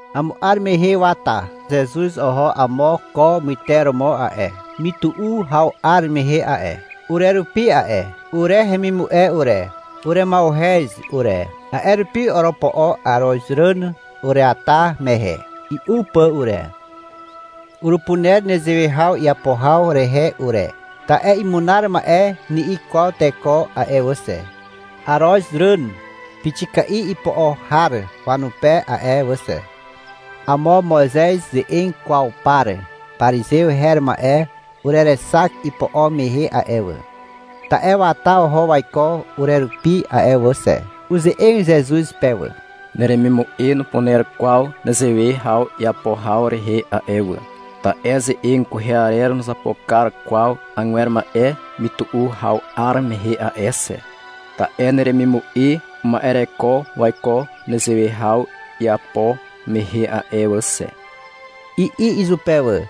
Amo 'ar mehe wata Zezuz oho amo ko myteromo a'e, mytu'u haw 'ar mehe a'e, urerupi a'e. Ure hemimu'e ure, urema'uhez ure. A'e rupi oropo'o arozràn ureata mehe, i'u pà ure. (Urupuner nezewe haw iapo haw rehe ure, ta'e — Imunar ma'e, ni'i kwaw teko a'e wà xe, arozràn pixika'i ipo'o har wanupe a'e wà xe). Amo Moizez ze'eg kwaw par parizew her ma'e urerexak ipo'o mehe a'e wà, (ta'e wata oho waiko urerupi a'e wà xe). Uze'eg Zezuz pe wà. — Neremimu'e nupuner kwaw nezewe haw iapo haw rehe a'e wà, ta'e ze'eg kwehe arer nuzapo kar kwaw agwer ma'e mytu'u haw 'ar mehe a'e xe, ta'e neremimu'e uma'ereko waiko nezewe haw iapo mehe a'e wà xe, i'i izupe wà.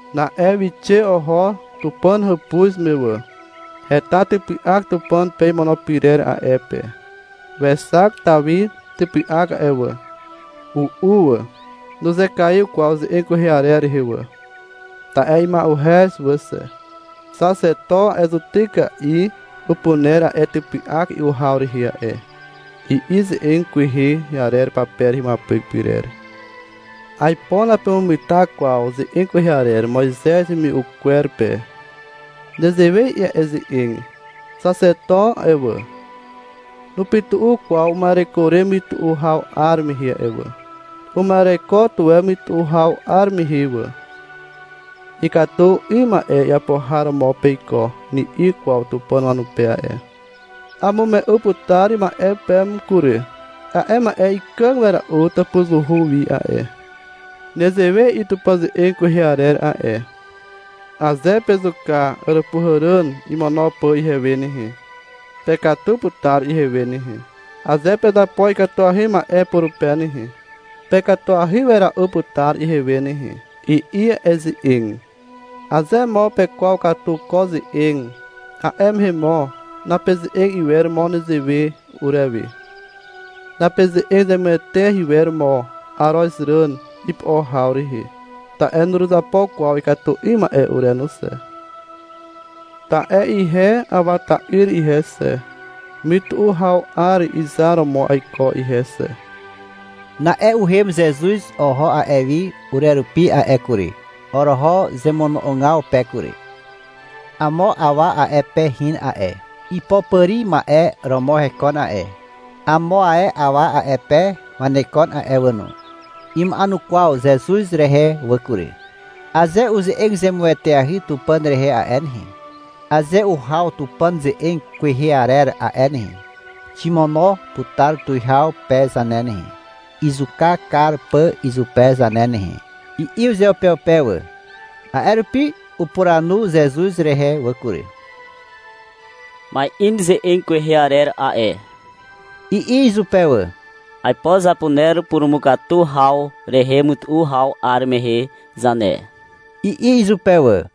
Na'e wixe oho Tupàn hàpuz me wà. Heta typy'ak Tupàn pe imono pyrer a'e pe. Wexak Tawi typy'ak a'e wà. U'u wà. Nuzekaiw kwaw ze'eg kwehe arer rehe wà. Ta'e ima'uhez wà xe. — Xaxeto a'e zutyka'i upuner a'e typy'ak i'u haw rehe a'e, i'i ze'eg kwehe arer pape rehe imuapyk pyrer. Aipo napemugeta kwaw ze'eg kwehe arer Moizez hemimume'u kwer pe. Nezewe i'i a'e ze'eg. Xaxeto a'e wà, nupytu'u kwaw uma'ereko re mytu'u haw 'ar mehe a'e wà. (Uma'ereko tuwe mytu'u haw 'ar mehe wà.) — Ikatu 'ym ma'e iapo har romo peiko, ni'i kwaw Tupàn wanupe a'e. Amume'u putar ma'e peme kury. A'e ma'e ikàg wera'u tàpuzuhu wi a'e. Nezewe i'i Tupàn ze'eg kwehe arer a'e. — Aze pezuka àràpuhàràn imur pà ihewe nehe, pekatu putar ihewe nehe. Aze pezapo ikatuahy ma'e purupe nehe, pekatuahy wera'u putar ihewe nehe, i'i a'e ze'eg. — Aze mo pekwaw katu ko ze'eg, a'e mehe mo napeze'eg iwer mo nezewe urewe, napeze'eg zemueteahy iwer mo arozràn ipo'o haw rehe. Ta'e nuruzapo kwaw ikatu 'ym ma'e ure no xe. Ta'e ihe Awa ta'yr ihe xe, mytu'u haw 'ar izar romo aiko ihe xe. Na'e uhem Zezuz oho a'e wi urerupi a'e kury. Oroho zemono'ogaw pe kury. Amo awa a'e pe hin a'e. Ipopàri ma'e romo hekon a'e. Amo ae awa a'e pe wanekon a'e wà no. Ima'enukwaw Zezuz rehe wà kury. — Aze uze'eg zemueteahy Tupàn rehe a'e nehe, aze uhaw Tupàn ze'eg kwehe arer a'e nehe, ximono putar tuwihaw pe zane nehe, izuka kar pà izupe zane nehe, i'i uzeupeupe wà. A'e rupi upuranu Zezuz rehe wà kury. — Ma'in ze'eg kwehe arer a'e, i'i izupe wà. — Aipo zapuner purumukatu haw rehe mytu'u haw 'ar mehe zane, i'i izupe wà.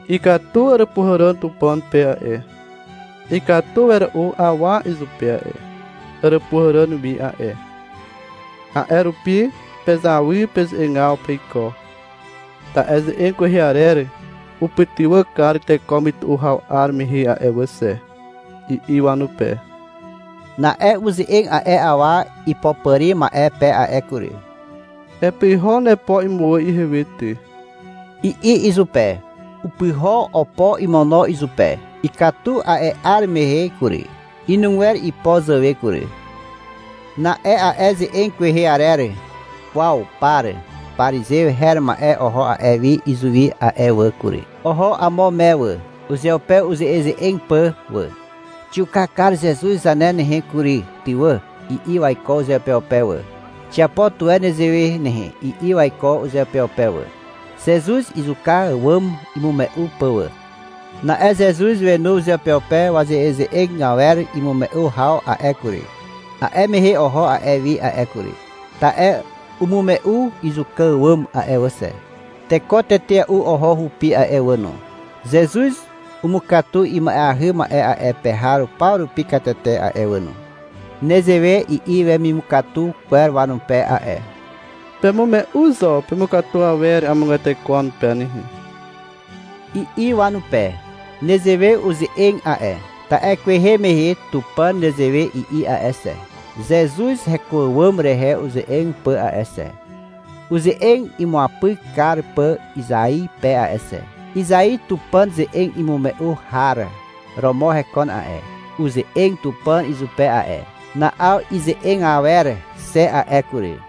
— Ikatu àràpuhàràn Tupàn pe a'e. Ikatu wera'u awa izupe a'e, àràpuhàràn wi a'e. A'e rupi pezawy peze'egaw peiko, ta'e ze'eg kwehe arer upytywà kar teko mytu'u haw 'ar mehe a'e wà xe, i'i wanupe. Na'e uze'eg a'e awa ipopàri ma'e pe a'e kury. — Epyho nepo imuwà ihewe ty, i'i izupe. Upyho opo imono izupe. Ikatu a'e 'ar mehe kury, inugwer ipo zàwe kury. Na'e a'e ze'eg kwehe arer kwaw par parizew her ma'e oho a'e wi izuwi a'e wà kury. Oho amo me wà, uzeupe uze'eze'eg pà wà. — Xiuka kar Zezuz zane nehe kury ty wà, i'i waiko uzeupeupe wà. — Xiapo tuwe nezewe nehe, i'i waiko uzeupeupe wà, Zezuz izuka àwàm imume'u pà wà. Na'e Zezuz wenu uzeupeupe waze'eze'eg awer imume'u haw a'e kury. A'e mehe oho a'e wi a'e kury. (Ta'e umume'u izuka àwàm a'e wà xe.) Teko tetea'u oho hupi a'e wà no. Zezuz umukatu ima'eahy ma'e a'e pe har paw rupi katete a'e wà no. Nezewe i'i wemimukatu kwer wanupe a'e. — Pemume'u zo pemukatu awer amogwer teko wanupe nehe, i'i wanupe. Nezewe uze'eg a'e, ta'e kwehe mehe Tupàn nezewe i'i a'e xe, Zezuz heko àwàm rehe uze'eg pà a'e xe, uze'eg imuapyk kar pà Izai pe a'e xe. Izai Tupàn ze'eg imume'u har romo hekon a'e. Uze'eg Tupàn izupe a'e. Na'aw ize'eg awer xe a'e kury.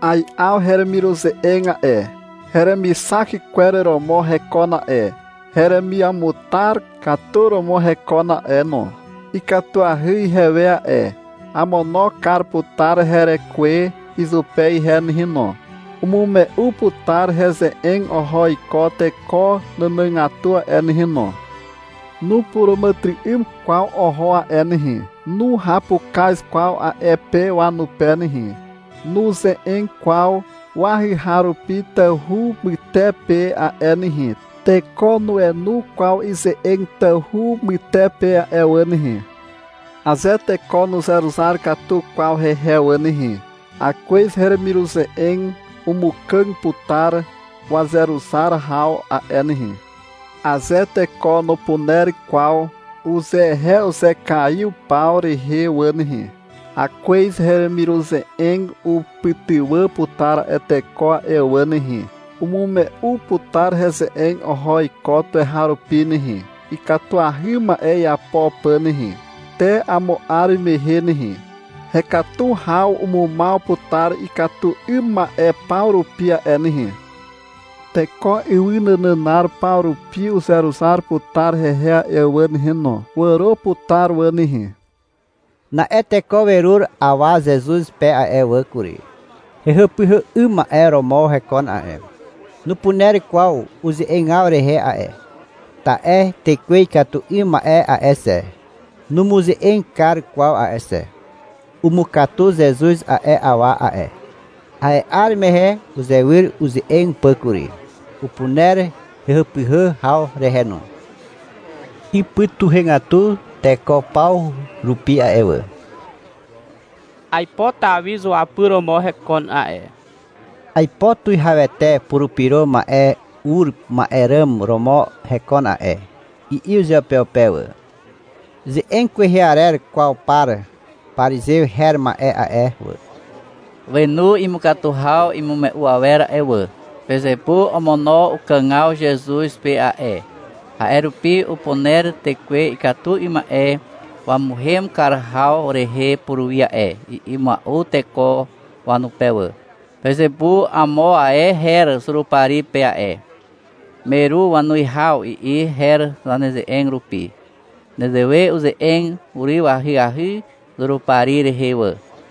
Ai'aw heremiruze'eg a'e. Heremixak kwer romo hekon a'e. Heremiamutar katu romo hekon a'e no. Ikatuahy ihewe a'e. Amono kar putar herekwe izupe ihe nehe no. Umume'u putar heze'eg oho iko teko nànàgatu a'e nehe no. Nupuràmàtyry'ym kwaw oho a'e nehe. Nuhapukaz kwaw a'e pe wanupe nehe. Nuze'eg kwaw wahyhaw rupi tawhu mytepe a'e nehe. Teko nuenu kwaw ize'eg tawhu mytepe a'e wà nehe. Aze teko nuzeruzar katu kwaw hehe wà nehe, Akwez heremiruze'eg umukàg putar wazeruzar haw a'e nehe. Aze teko nupuner kwaw uzehe uzekaiw paw rehe wà nehe, Akwez heremiruze'eg upytywà putar a'e teko a'e wà nehe. Umume'u putar heze'eg oho iko tuweharupi nehe, Ikatuahy ma'e iapo pà nehe. Te amo 'ar mehe nehe, Hekatu haw umumaw putar ikatu 'ym ma'e paw rupi a'e nehe. Teko ywy nànànar paw rupi uzeruzar putar hehe a'e wà nehe no, wàro putar wà nehe. Na'e teko werur awa Zezuz pe a'e wà kury. Hehàpyhà 'ym ma'e romo hekon a'e. Nupuner kwaw uze'egaw rehe a'e, ta'e tekwe ikatu 'ym ma'e a'e xe, numuze'eg kar kwaw a'e xe. Umukatu Zezuz a'e awa a'e. A'e 'ar mehe uzewyr uze'eg pà kury, Upuner hehàpyhà haw rehe no. Ipytuhegatu teko paw rupi a'e wà. — Aipo Tawi zuapyr romo hekon a'e (aipo Tuwihawete Purupyro Ma'e ur ma'e ràm romo hekon a'e), i'i uzeupeupe wà. Ze'eg kwehe arer kwaw par parizew her ma'e a'e wà, wenu imukatu haw imume'u awer a'e wà. — Pezepu omono ukàgaw Zezuz pe a'e, a'e rupi upuner tekwe ikatu 'ym ma'e wamuhem kar haw rehe puruwi a'e, i'i mua'u teko wanupe wà. (— Pezepu amo ae her Zurupari pe a'e. — Meru wanuwihaw, i'i her zaneze'eg rupi. Nezewe uze'eg uryw ahyahy Zurupari rehe wà.)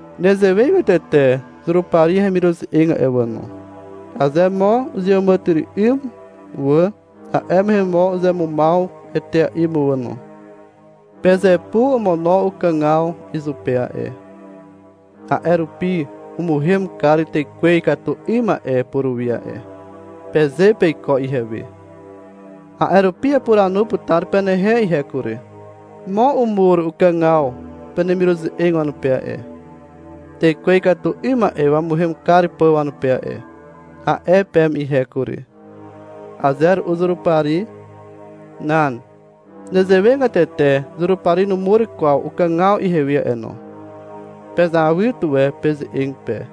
Nezewegatete Zurupari hemiruze'eg a'e wà no. Aze mo uzeàmàtyry'ym wà, a'e mehe mo uzemumaw etea'i mo wà no. — Pezepu omono ukàgaw izupe a'e, a'e rupi umuhem kar tekwe ikatu 'ym ma'e puruwi a'e, peze peiko ihewe. A'e rupi apuranu putar penehe ihe kury. — Mo umur ukàgaw penemiruze'eg wanupe a'e, tekwe ikatu 'ym ma'e wamuhem kar pà wanupe a'e, a'e peme ihe kury. Aze ru'u Zurupari. Nan. Nezewegatete Zurupari numur kwaw ukàgaw ihewe a'e no. Pezawy tuwe peze'eg pe.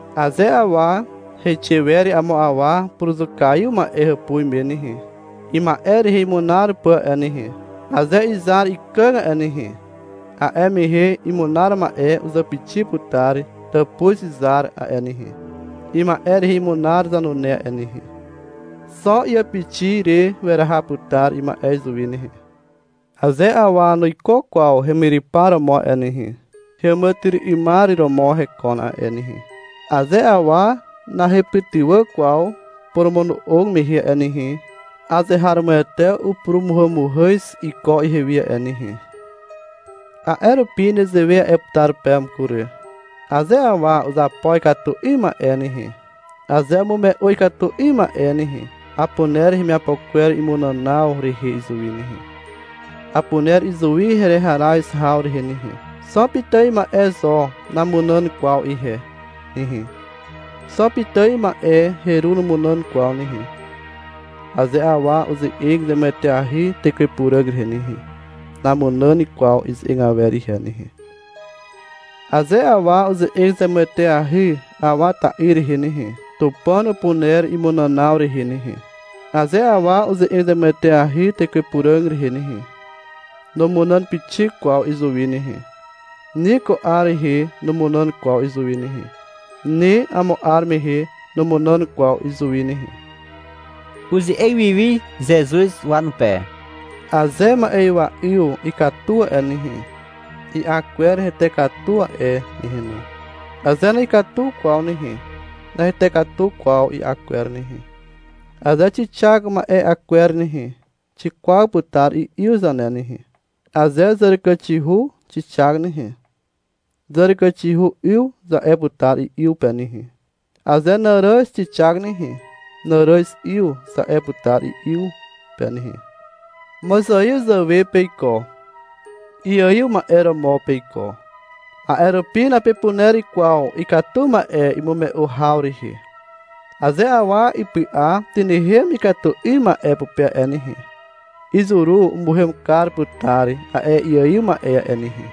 Aze awa heixe wer amo awa puruzukaiw ma'e hàpuz me nehe, ima'e rehe imunar pà a'e nehe, aze izar ikàg a'e nehe, a'e mehe imunar ma'e uzàpixi putar tàpuz zar a'e nehe, ima'e rehe imunar zanune a'e nehe. Xo iàpixi re weraha putar ima'e izuwi nehe. Aze awa nuiko kwaw hemyrypar romo a'e nehe, heàmàtyry'ymar romo hekon a'e nehe. Aze awa nahepytywà kwaw poromono'og mehe a'e nehe, azeharomoete upurumuhàmuhàz iko ihewi a'e nehe. A'e rupi nezewe a'e putar peme kury. — Aze awa uzapo ikatu 'ym ma'e nehe, aze umume'u ikatu 'ym ma'e nehe, apuner hemiapo kwer imunànaw rehe izuwi nehe, apuner izuwi hereharaz haw rehe nehe. Xo pitài ma'e zo namunàn kwaw ihe nehe, xo pitài ma'e heru numunàn kwaw nehe. Aze awa uze'eg zemueteahy Tekwe Puràg rehe nehe, namunàn kwaw ize'eg awer ihe nehe. Aze awa uze'eg zemueteahy Awa ta'yr rehe nehe, Tupàn upuner imunànaw rehe nehe. Aze awa uze'eg zemueteahy Tekwe Puràg rehe nehe, numunàn pixik kwaw izuwi nehe, ni ko 'ar rehe numunàn kwaw izuwi nehe. Ni amo 'ar mehe numunàn kwaw izuwi nehe. (Uze'eg wiwi Zezuz wanupe.) — Aze ma'ywa'yw ikatu a'e nehe, i'a kwer hete katu a'e nehe no. Aze na'ikatu kwaw nehe, nahete katu kwaw i'a kwer nehe. Aze xixak ma'e'a kwer nehe, xikwaw putar i'yw zane nehe. (Aze zàràkàxihu xixak nehe, — Zàràkàxihu 'yw, za'e putar i'yw pe nehe. Aze nàràz xixak nehe, — Nàràz 'yw, za'e putar i'yw pe nehe.) Mozaiw zàwe peiko. Iaiw ma'e romo peiko. A'e rupi napepuner kwaw ikatu ma'e imume'u haw rehe. Aze awa ipy'a tynehem ikatu 'ym ma'e pupe a'e nehe, izuru umuhem kar putar a'e iaiw ma'e a'e nehe.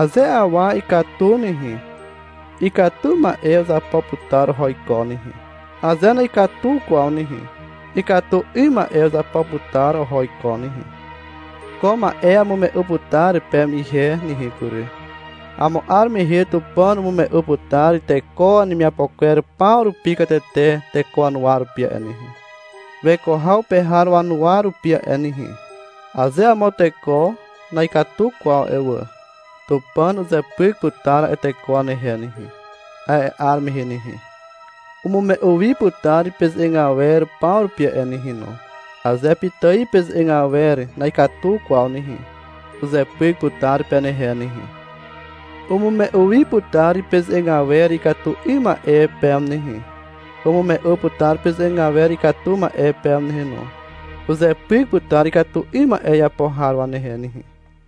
Aze awa ikatu nehe, ikatu ma'e uzapo putar oho iko nehe. Aze na'ikatu kwaw nehe, ikatu 'ym ma'e uzapo putar oho iko nehe. Ko ma'e amume'u putar peme ihe nehe kury. — Amo 'ar mehe Tupàn umume'u putar teko wanemiapo kwer paw rupi katete teko wanuwa rupi a'e nehe, weko haw pe har wanuwa rupi a'e nehe. Aze amo teko na'ikatu kwaw a'e wà. Tupàn uzepyk putar a'e teko wanehe nehe. A'e 'ar mehe nehe, umume'u wi putar peze'eg awer paw rupi a'e nehe no. Aze pitài peze'eg awer na'ikatu kwaw nehe, uzepyk putar penehe nehe. Umume'u wi putar peze'eg awer ikatu 'ym ma'e peme nehe. Umume'u putar peze'eg awer ikatu ma'e peme nehe no. Uzepyk putar ikatu 'ym ma'e iapo har wanehe nehe.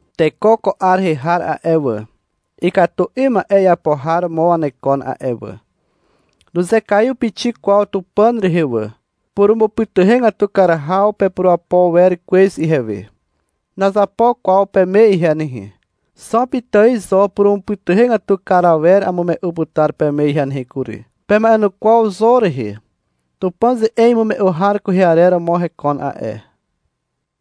— Teko ko 'ar rehe har a'e wà, ikatu 'ym ma'e iapo har romo wanekon a'e wà. Nuzekaiw pixik kwaw Tupàn rehe wà. Purumupytuhegatu kar haw rehe pepurapo kar wer kwez ihewe. Nazapo kwaw peme ihe nehe. Xo pitài zo purumupytuhegatu kar awer amume'u putar peme ihe nehe kury. Pema'enukwaw Zon rehe. Tupàn ze'eg imume'u har kwehe arer romo hekon a'e.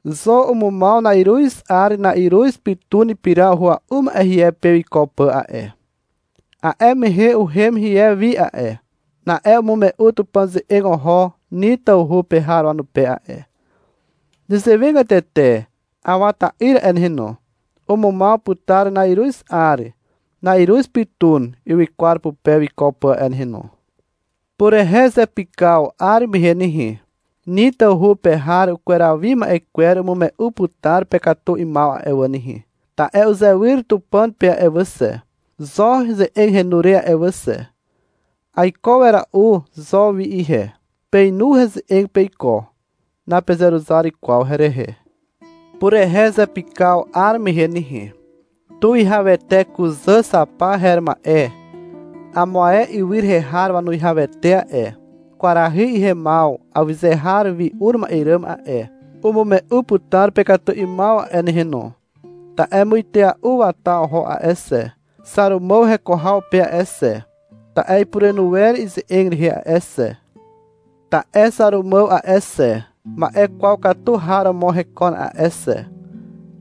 Zon umumaw na'iruz 'ar na'iruz pytun ipira uhua'u ma'e hie pe wiko pà a'e. (A'e mehe uhem hie wi a'e. Na'e umume'u Tupàn ze'eg oho Nin tawhu pe har wanupe a'e.) Nezewegatete Awa ta'yr a'e nehe no. Umumaw putar na'iruz 'ar na'iruz pytun ywykwar pupe wiko pà a'e nehe no. Purehe zepykaw 'ar mehe nehe, Nin tawhu pe har ukweraw wi ma'e kwer umume'u putar pekatu 'ymaw a'e wà nehe. Ta'e uzewyr Tupàn pe a'e wà xe, Zon ze'eg henu re a'e wà xe. Aiko wera'u Zon wi ihe. Peinu heze'eg peiko. Napezeruzar kwaw herehe. Purehe zepykaw 'ar mehe nehe, tuwihawete kuzà Xapa her ma'e, amo ae ywy rehe har wanuwihawete a'e, kwarahy ihemaw awyze har wi ur ma'e ràm a'e, umume'u putar pekatu 'ymaw a'e nehe no, ta'e muitea'u wata oho a'e xe, Xàrumàw heko haw pe a'e xe, ta'e ipurenu wer ize'eg rehe a'e xe. Ta'e Xàrumàw a'e xe, ma'e kwaw katu har romo hekon a'e xe,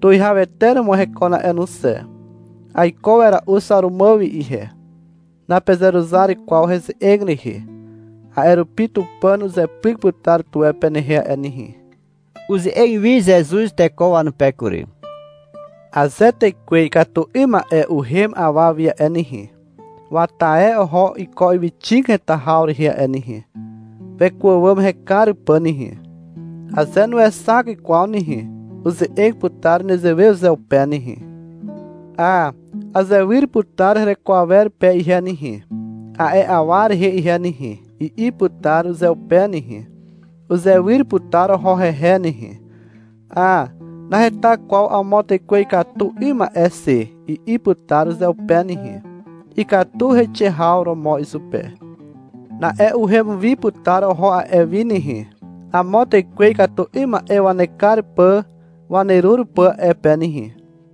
tuwihawete romo hekon a'e no xe. Aiko wera'u Xàrumàw wi ihe. Napezeruzar kwaw heze'eg rehe. A'e rupi Tupàn uzepyk putar tuwe penehe a'e nehe. Uze'eg wi Zezuz teko wanupe kury. — Aze tekwe ikatu 'ym ma'e uhem awa wi a'e nehe, wata e oho iko ywyxig heta haw rehe a'e nehe, weko àwàm hekar pà nehe. Aze nuexak kwaw nehe, uze'eg putar nezewe uzeupe nehe. — Hà, azewyr putar hereko awer pe ihe nehe, a'e awa rehe ihe nehe, i'i putar uzeupe nehe. Uzewyr putar oho hehe nehe. — Hà, naheta kwaw amo tekwe ikatu 'ym ma'e xe, i'i putar uzeupe nehe. Ikatu heixe haw romo izupe. Na'e uhem wi putar oho a'e wi nehe, amo tekwe ikatu 'ym ma'e wanekar pà wanerur pà a'e pe nehe.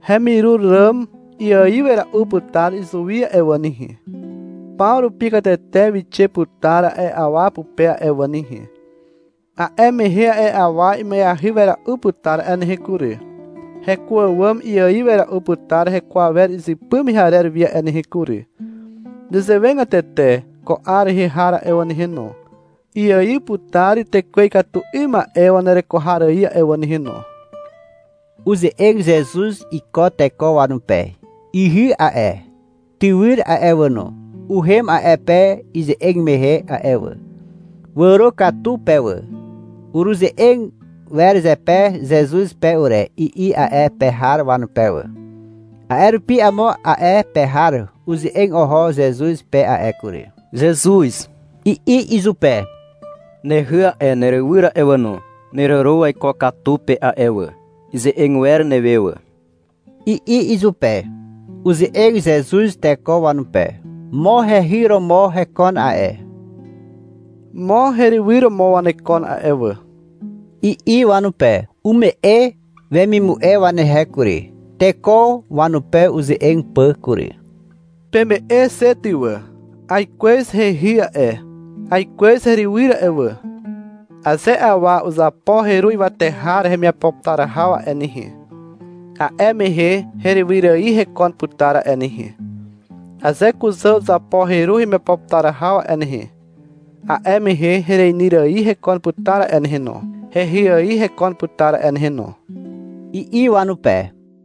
Hemirur ràm iaiw wera'u putar izuwi a'e wà nehe. Paw rupi katete wixe putar a'e awa pupe a'e wà nehe. A'e mehe a'e awa ima'eahy wera'u putar a'e nehe kury. Heko àwàm iaiw wera'u putar heko awer izypy mehe arer wi a'e nehe kury. (Nezewegatete ko 'ar rehe har a'e wà nehe no, iaiw putar tekwe ikatu 'ym ma'e wanereko har ài a'e wà nehe no.) Uze'eg Zezuz iko teko wanupe. Ihy a'e, tywyr a'e wà no, uhem a'e pe ize'eg mehe a'e wà. Wàro katu pe wà. — Ureze'eg wer zepe Zezuz pe ure, i'i a'e pe har wanupe wà. A'e rupi amo a'e pe har uze'eg oho Zezuz pe a'e kury. — Zezuz, i'i izupe. — Nehy a'e, nerywyr a'e wà no, neràro waiko katu pe a'e wà. Ize'eg wer newe wà, i'i izupe. Uze'eg Zezuz teko wanupe. — Mo hehy romo hekon a'e. Mo herywyr romo wanekon a'e wà, i'i wanupe. Ume'e wemimu'e wanehe kury, teko wanupe uze'eg pà kury. — Peme'e xe ty wà. Aikwez hehy a'e, aikwez herywyr a'e wà. Aze awa uzapo heru ywate har hemiapo putar haw a'e nehe, a'e mehe herywyr ài hekon putar a'e nehe. Aze kuzà uzapo heru hemiapo putar haw a'e nehe, a'e mehe hereinyr ài hekon putar a'e nehe no, hehy ài hekon putar a'e nehe no, i'i wanupe.